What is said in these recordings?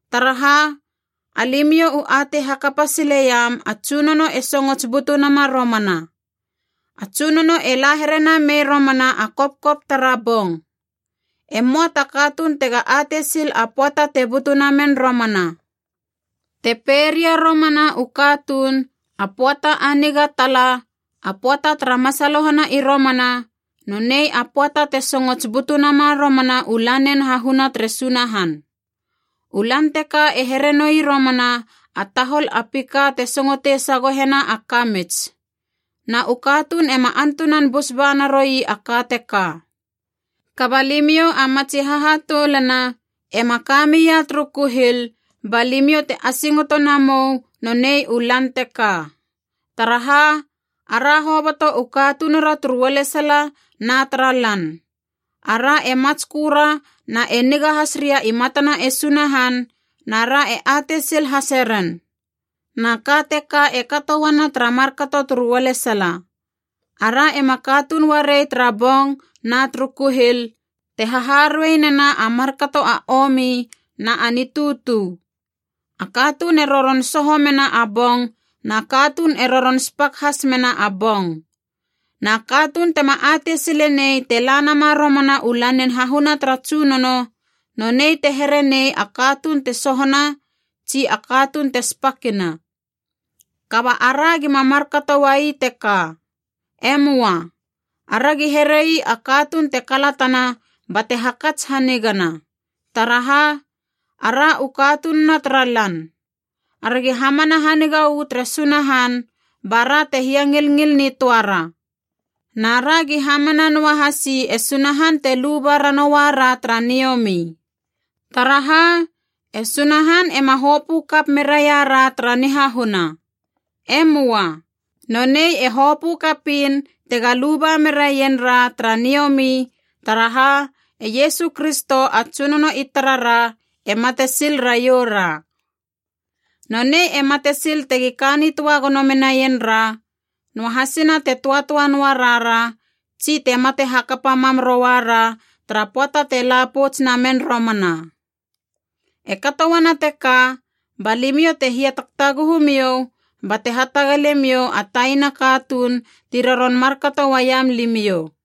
Taraha, alimiou u atei hakapa sileiam a Tsunono e songots butu nama romana. A Tsunono e la here namei romana a kopkop tara bong. E möa ta katuun tega atei sil a pöata te butu namen romana. Te pei ria romana u katuun, “A pöata a niga tala, a pöata tara masalohana i romana,” nonei a pöata te songots butu nama romana u Lanin Hahuna tere Sunahan. U Lan teka e here noi romana a tahol a pika te singotei sagohena a kamits. Na u katuun ema antunan bus ba naroi a ka teka. Kaba limiou a matsi hahatoulana ema ka mia turu kuhil, ba limiou te asingoto namou nonei u lan teka. Taraha, ara hoboto u katunura turu ualesala na tara lan. Ara e matsköra na e niga has ria i matana e Sunahan, nara e atei sil hase ren. Na ka teka e kato uana tara markato turu ualesala. Ara ema katuun uarei tara bong na turu kuhil, te haharuei nena a markato a omi na a nitutu. A katuun e roron soho mena a bong na katuun e roron spak has mena a bong. Na katuun tema atei sile nei te la nama romana u Lanin Hahuna tara Tsunono, nonei te here nei a katuun te sohona tsi a katuun te spakina. Kaba ara gima markato uai teka. E möa. Aragi here ii a katuun te kalatana bate hakats hanigana. Taraha, ara u katununa tara lan. Aragi hamana haniga uu tere Sunahan bara te hiangilngil nitöara. Na ragi hamana noahasi e Sunahan te luba ranoua ra tara niomi. Taraha, e Sunahan ema hopö kap meraira tara nihahuna. E möa. Nonei e hopö kapiin tega luba meraien ra tara niomi, taraha e Iesu Kristo a Tsunono i tarara e mate sil raioura. Nonei e mate sil tegi ka nitöa gono menaien ra, noahasina te töatöa noa roa ra tsi te mate hakapa mam rouara tara pöata te la pouts namen romana. E kato uana teka, ba limiou te hiatagtaguhu miou bate hatagale miou a taina katuun ti roron markato uaiam limiou.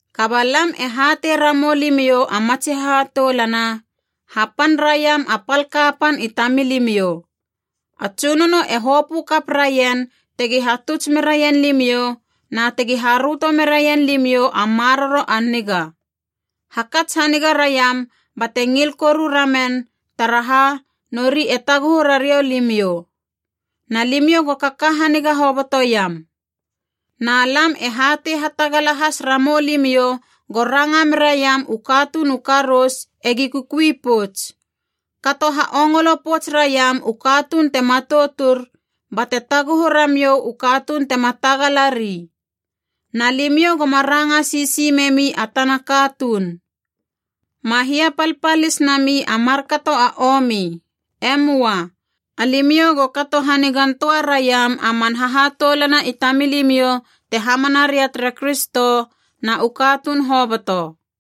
Kaba lam e hatei ramou limiou a matsi hahatoulana, hapan raiam a pal kapan i tamilimiou. A Tsunono e hopö kap raien tegi hatuts meraien limiou na tegi haröto meraien limiou a maroro a niga. Hakats haniga raiam bate ngil koru ramen taraha, nori e taguhu rariou limiou. Na limiou go kaka haniga hobotoiam. Na lam e hatei hatagala has ramou limiou go ranga meraiam u katuun u karous egi kukui pouts. Kato ha ongolo pouts raiam u katuun te matoutur, bate taguhu ramiou u katuun tema tagalari. Na limiou goma ranga sisi memi a tana katuun. Ma hiapalpalis nami a markato a omi. E möa. Alimiou go kato hanigan töa raiam a man hahatoulana i tamilimiou te hamana ria tere Kristo, na u katuun hoboto.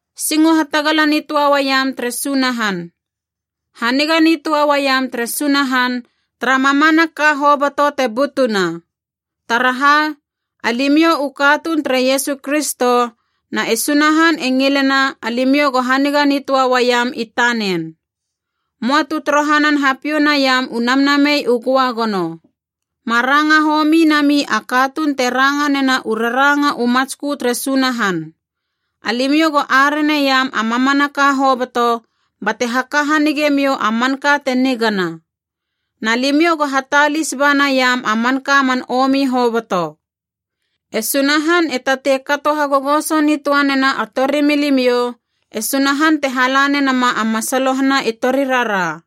Singo hatagala nitöa uaiam tere Sunahan. Haniga nitöa uaiam tere Sunahan tara mamanaka hoboto te butuna. Taraha, alimiou u katuun tere Iesu Kristo, na e Sunahan e ngilena alimiou go haniga nitöa uaiam i tanen. Möa tu torohanan hapiou naiam u Namnamei u Göagono. Ma ranga homi nami a katuun te ranga nena u raranga u matskö tere Sunahan. Alimiou go areneiam a mamanaka hoboto, bate haka hanigemiou a manka te nigana. Na limiou go hatalis ba naiam a manka man omi hoboto. E Sunahan e tatei kato hagogoso nitöanena a torimilimiou, e Sunahan te hala nenama a masalohana i torirara.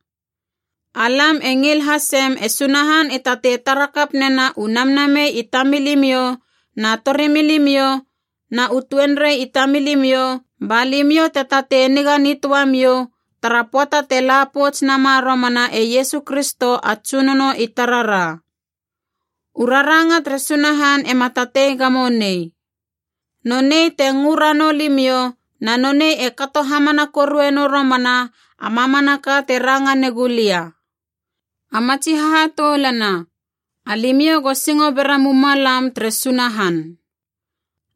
Alam e ngil hasem e Sunahan e tatei tara kap nena u namnamei i tamilimiou na torimilimiou na u tuenrei i tamilimiou, ba limiou te tatei niga nitöamiou tara pöata te la pouts nama romana e Iesu Kristo a Tsunono i tarara. U raranga tere Sunahan ema tatei gamo nei. Nonei te ngö ranou limiou na nonei e kato hamana korue nou romana a mamanaka te ranga negula lia. A matsi hahatoulana, alimiou go singo bera mumalam tere Sunahan.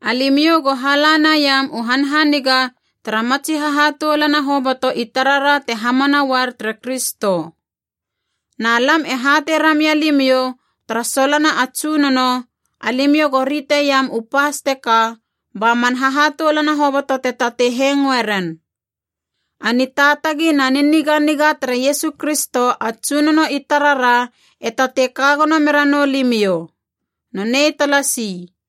Alimiou go hala naiam u hanhaniga tara matsi hahatoulana hoboto i tarara te hamana uar tere Kristo. Na lam e hatei ramia limiou tara solona a Tsunono, alimiou go riteiam u pas teka ba man hahatoulana hoboto te tatei hengoe ren. A nitaatagi na niniganiga tere Iesu Kristo a Tsunono i tarara e tatei kagono meranou limiou. Nonei talasi.